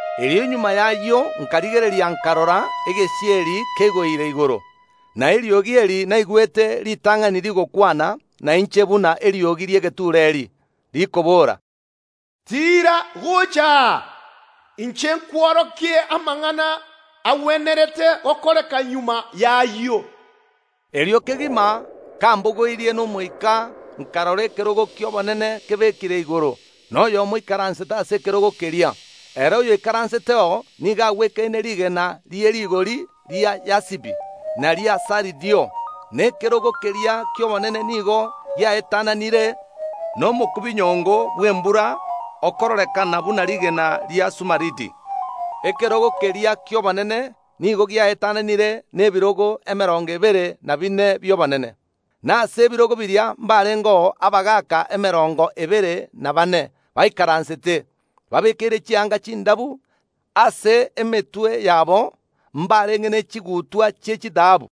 Erio magega y’ayio nkarigereria, nkarora egesieri keigoire igoro. Na eriogi eri naigwete ritang’ani rigakwana nainche buna eriogi ri’egetureeri, rikobora, “Tiira gocha aa, inche nkworokie amang’ana agwenerete gokoreka magega y’ayio.” Erio kegima, kambogoirie n’Omoika, nkarora ekerogo ki’obonene kebekire igoro, na oyomo oikaransete ase ekerogo keria. Ere oyoikaranseteo nigo agwekaine rigena rie rigori ria yasipi na ria saridio, na ekerogo keria ki’obonene nigo giaetananire nomokubinyongo bw’embura, okororekana buna rigena ria sumaridi. Ekerogo keria ki’obonene nigo giaetananire nebirogo emerongo ebere na bine bi’obonene, na ase ebirogo biria mbarengeo abagaaka emerongo ebere na baane baikaransete, babeekeire chianga chindabu. Ase emetwe yabo mbarenge ne chigutwa chi’echitaabu.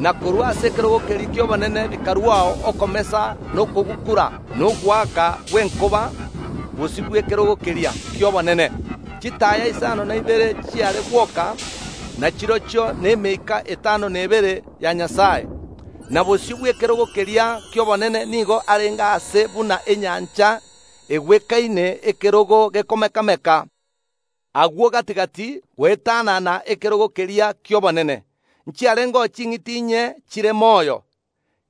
Na korwa ase ekerogo keria ki’obonene bikaruao okomesa na okogukura, na ogoaka gw’enkoba. Bosio bw’ekerogo keria ki’obonene chitaaya isano na ibere chiare gwoka, na chirochio nemeika etano na ebere ya Nyasae. Na bosio bw’ekerogo keria ki’obonene nigo arenge aase buna enyancha egwekaine ekerore gekomeka‐meka. Agwo gati‐gati goetanana ekerogo keria ki’obonene nchiarengeo ching’iti inye chire moyo,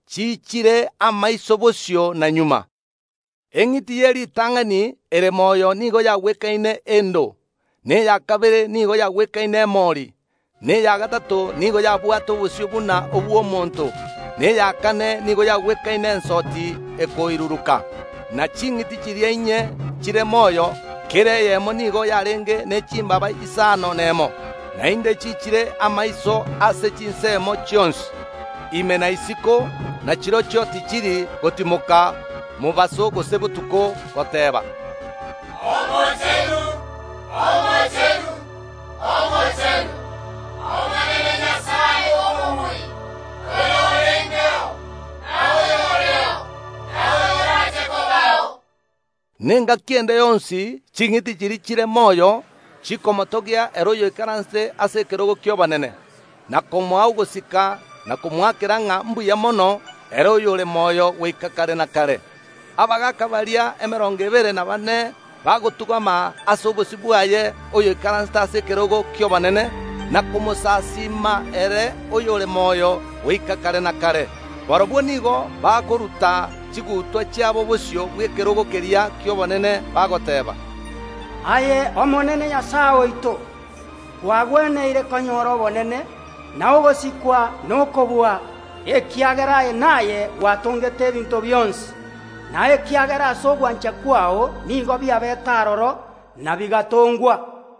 chiichire amaiso bosio na magega. Eng’iti ye ritang’ani ere moyo nigo yagwekaine endo, na eya kabere nigo yagwekaine emori, na eya gatato nigo yabwate obosio buna obw’omonto, na eya kane nigo yagwekaine ensoti ekoiruruka. Ne ching’iti chiria inye chire moyo, kera eyemo niyo yarenge ne chimbaaba isano nemo, naende chiichire amaiso ase chinsemo chionsi, ime na isiko. Na chirochio tichiri gotimoka mobaso gose botuko goteeba, “Omochenu, Omochenu, Omochenu, Omonene Nyasae Omobui, oyorengeo, na oyoreo, na oyorache kobao!” Na engaki ende yonsi ching’iti chiria chire moyo chikomotogia ere oyoikaransete ase ekerogo ki’obonene, na komoa ogosika, na komoakera ng’a mbuya mono, ere oyore moyo goika kare na kare, abagaaka baria emerongo ebere na baane bagotung’ama ase obosio bwaye oyoikaransete ase ekerogo ki’obonene, na komosasiima ere oyore moyo goika kare na kare. Barabwo nigo bakoruta chigutwa chiabo bosio bw’ekerogo keria ki’obonene, bagoteeba, “Aye Omonene Nyasae oito, kwagweneire konyora obonene, na ogosikwa, na okobua, ekiagera aye naye gwatongete ebinto bionsi; na ekiagera ase ogwancha kwao nigo biabeete aroro, na bigatongwa.”